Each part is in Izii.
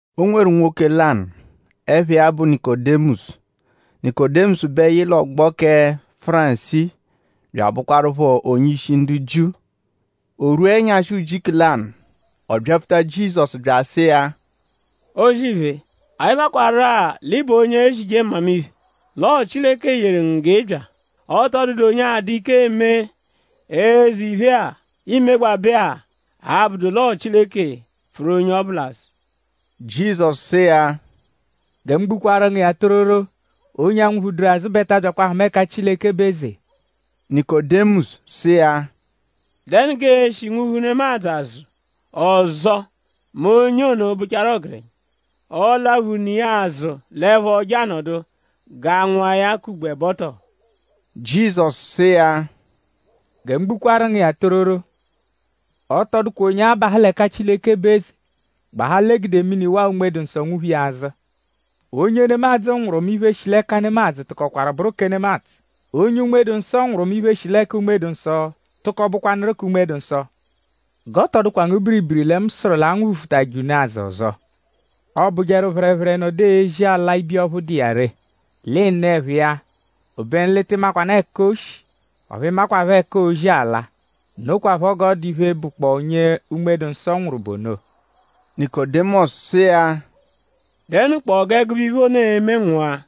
O nweru nwoke lanụ, ẹpha iya bụ Nikodimọsu. Nikodimọsu bẹ yị l'ọgbo kẹ Fárisii bya abụkwarupho onye-ishi ndu Jiu. O rwua ẹnyashi ujiku lanụ; ọ byapfuta Jizọsu bya asụ iya: “O-zì-iphe! Anyi makwarụ-a l'ị bụ onye ezije mmamiphe; l'ọo Chileke yeru ngu g'ị bya. Ọ tọ dụdu onye a-dụ ike eme eze iphe-a, iimegbabẹ-a, abụdu l'ọo Chileke pfụru onye ọbu l'azụ.” Jizọsu sụ iya: “Gẹ mu gbukwaaru ngu iya tororo; onye aanwụ-phuduru azụ bẹ ta abyakwa ahụma ẹka Chileke bụ eze.” Nikodimọsu sụ iya: “?Dẹnu g'ee-shi nwụ-phu nemadzụ azụ ọzo mẹ onye ono bụchaaru ọgerenya??Ọo-laphu ne iya azụ l'ẹpho je anọdu g'a nwụa ya k'ugbo ẹbo tọo?” Jizọsu sụ iya: “Gẹ mu gbukwaru ngu iya tororo; ọ tọ dụkwa onye abahụ l'ẹka Chileke bụ eze; gbahaa l'e gude mini; waa Unme-dụ-Nsọ nwụ-phu iya azụ. Onye nemadzụ nwụru; mẹ iphe, shi l'ẹka nemadzụ tụkokwaru bụru kẹ nemadzụ. Onye Unme-dụ-Nsọ nwụru; mẹ iphe, shi l'ẹka Unme-dụ-Nsọ tụko bụkwanuru kẹ Unme-dụ-Nsọ. G'ọ tọ dụkwa ngu biribiri lẹ mu sụru l'anwụ-phufụtaje unu azụ ọzo. Ọobujeru; phẹrephere -nọdu ezi ala ibiya ọphu dụ iya ree l'ị nụ ẹphu iya; obenu l'ị tị makwanụ ẹka o shi; ọphu i makwaphọ ẹka oozi ala. Nokwaphọ g'ọ dụ iphe, bụkpoo onye Unme-dụ-Nsọ nwụru bụ ono.” Nikodimọsu sụ iya: “?Dẹnukpoo g'ẹgube iphe ono e-me nwụa?”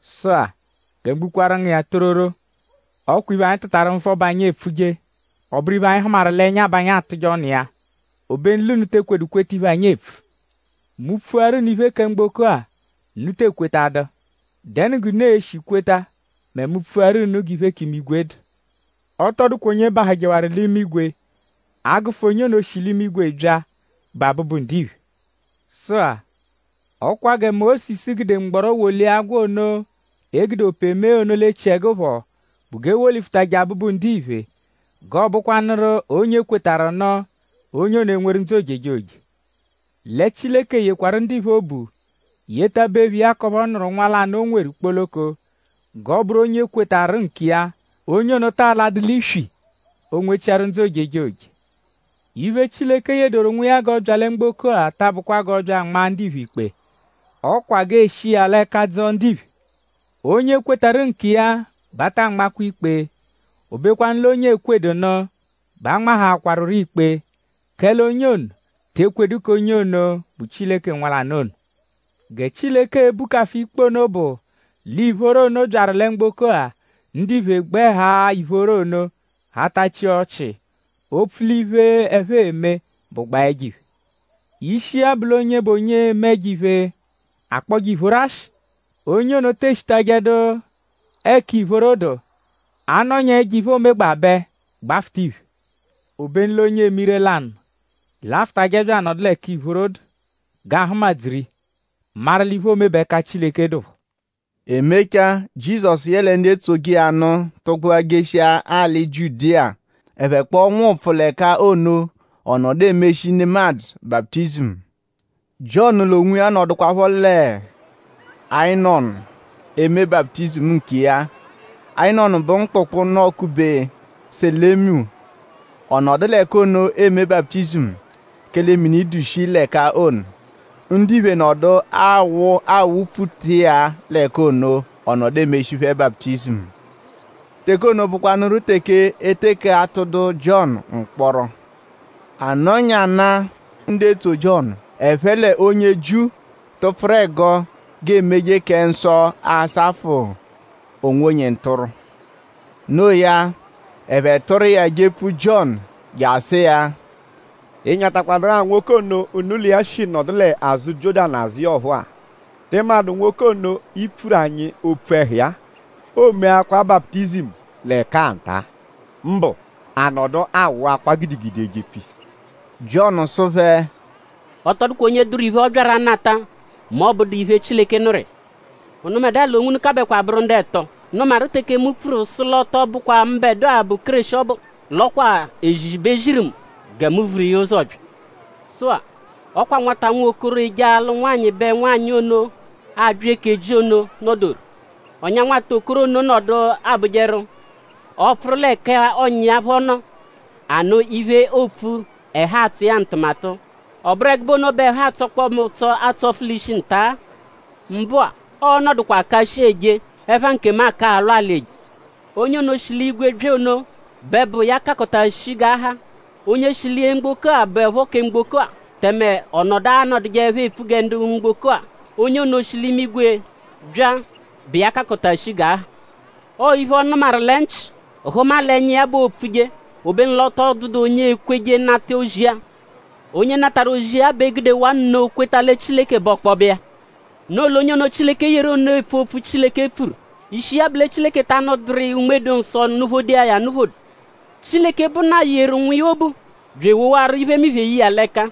Sụ-a; gẹ mu gbukwaaru ngu iya tororo; ọ kwa iphe, anyi tụtaru nvọ bẹ anyi epfuje; ọ bụru iphe, anyi hụmaru l'ẹnya bẹ anyi atụje ọnu iya; obenu l'unu te ekwedu kweta iphe, anyi epfu. Mu -pfuaru unu iphe kẹ mgboko-a; unu tee kwetadu.?Dẹnu g'unu e-shi kweta mẹ mu -pfuaru unu g'iphe k'imigwe dụ? Ọ tọ dụkwa onye bahụjewaru l'imigwe; a -gụfu onye ono, shi l'imigwe bya, bụ Abụbu-Ndiphe. “Sụ-a; ọ kwa gẹ Mósisu gude mgbọro wolia agwọ ono, e gude ope mee ono l'echiẹgu phọ bụ g'e wolifutajẹ Abụbu-Ndiphe g'ọo-bụkwanuru onye kwetarụ nụ; onye ono enweru ndzụ ojejoje. Lẹ Chileke yekwarụ ndiphe obu; yetabe iya k'ọphu ọ nụru Nwa lanụ, o nweru kpoloko: g'ọoburu onye kwetarụ nkiya; onye ono taa ladụ l'iswi; o nwechiaru ndzụ ojejoje. Iphe, Chileke yedoru Nwa iya g'ọ bya lẹ mgboko-a ta abụkwa g'ọ bya anmaa ndiphe ikpe. Ọ kwa g'ee-shi iya l'ẹka dzọo ndiphe. “Onye kwetarụ nkiya bẹ a taa nmakwa ikpe. O bekwanụ l'onye ekwedu nụ bẹ a nmahaakwarurọ ikpe; kẹle onye ono te ekwedu k'onye ono, bụ Chileke Nwa lanụ ono. Gẹ Chileke e-bukafu ikpe ono bụ; l'ìphóró ono byaru lẹ mgboko-a; ndiphe gbẹ haa ìphóró ono hatachia ọchii; opfu l'iphe, ẹphe eme bụgbaa ẹjo-iphe. Ishi iya bụ l'onye bụ onye eme ẹjo-iphe akpọje ìphóró ashị; onye ono te eshitajẹdu ẹka ìphóró dụ; a -nọnyaa ẹjo-iphe, oomegbabẹ gbafụta iphe. Obenu l'onye eme ire-lanụ l'afụtaje bya anọdu l'ẹka ìphóró dụ g'aa-hụma-dzuru iya; maru l'iphe oome bẹ ẹka Chileke dụpho.” E mechaa; Jizọsu yẹle ndu etsoje iya nụ tụgbua jeshia alị Jiudiya. Ẹphe kpọo nwụpfu l'ẹka ono; ọ nọdu emeshi nemadzụ baputizimu. Jiọnu l'onwiya nọdukwapho lẹ Inọnu eme baputizimu nkiya. Inọnu bụ mkpụkpu, nọ-kube Selimu. Ọ nọdu l'ẹka ono eme baputizimu; kẹle mini dụ shii l'ẹka ono. Ndiphe nọdu awụ awụ-pfuta iya l'ẹka ono; ọ nọdu emeshi phẹ baputizimu. Teke ono bụkwanuru teke e teke atụdu Jiọnu mkpọro. A nọnyanaa; ndu etso Jiọnu ẹphe l'onye Jiu tụpfuru ẹgo g'eemeje kẹ nsọ asafụ onwonye ntụrwu. Noo ya; ẹphe tụru iya jepfu Jiọnu je asụ iya: “?Ị nyatakwadụrua nwoke ono, unu l'iya shi nọdu l'azụ Jiọ́danu azụ iya ọphuu-a??Tị madụ nwoke ono, i pfuru anyi opfu ẹhu iya-a? O meakwa baputizimu l'ẹka-a nta-a. Mbụ; a nọdu awụakwa gidigidi ejepfu iya.” Jiọnu sụ phẹ: “Ọ tọ dụkwa onye dụru iphe, ọ byaru anata mẹ ọ -bụdu iphe, Chileke nụru iya. Unubẹdua l'onwunu kàbẹkwa bụru ndu ẹto, nụmaru teke mu pfuru sụ l'ọ tọ bụkwa mbẹdua bụ Kéreshi ọbu; l'ọ kwa èzìzì bẹ e ziru mu gẹ mu vuru iya ụzo bya. Sụ-a; ọ kwa nwata nwokoro, eje alụ nwanyị bẹ nwanyị ono, aabya eke ji ono nọ-doru. Ọ̀nyà nwata okoro ono nọdu abụjeru; ọ -pfụru l'ẹka ọ̀nyà iya phọ nọ anụ iphe, oopfu; ẹhu atsọ iya ntụmatu. Ọ bụru ẹgube ono bẹ ẹhu atsọkpoo mu ụtso atsọfu l'ishi nta-a. Mbụ-a; ọo-nọdukwa aka shii eje; ẹpha nkemu aka alwa alị eje.” “Onye ono, shi l'igwe bya ono bẹ bụ iya kakọta shii g'a ha. Onye shi lẹ mgboko-a bụepho kẹ mgboko-a; tẹme ọ nọdu anọdujeepho epfu gẹ ndu mgboko-a; onye ono, shi l'imigwe bya bụ iya kakọta shii g'a ha. Ọo iphe, ọ nụmaru lẹ nchị; hụma l'ẹnya iya bẹ oopfuje. Obenu l'ọ tọ dụdu onye ekweje nata ozi iya. Onye natarụ ozi iya bẹ gudewaa nno kweta lẹ Chileke bụ ọkpobe iya. Noo l'onye ono, Chileke yeru ono epfu opfu, Chileke pfuru. Ishi iya bụ lẹ Chileke ta anụduru iya Unme-dụ-Nsọ nụ-phodo iya ya anụ-phodo. Chileke, bụ Nna yeru Nwa iya obu; bya ewowaru iphemiphe ye iya l'ẹka.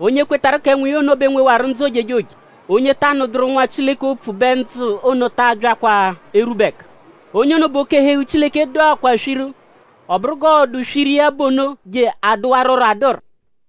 Onye kwetarụ kẹ Nwa iya ono bẹ nwewaru ndzụ ojejoje; onye ta anụduru Nwa Chileke opfu bẹ ndzụ ono ta abyakwa erwube ẹka. Onye ono bẹ oke-ẹhu-eghu Chileke dụakwaa swiru; ọ bụru g'ọo-dụ swiru iya bụ ono je adụwaruro adụru.”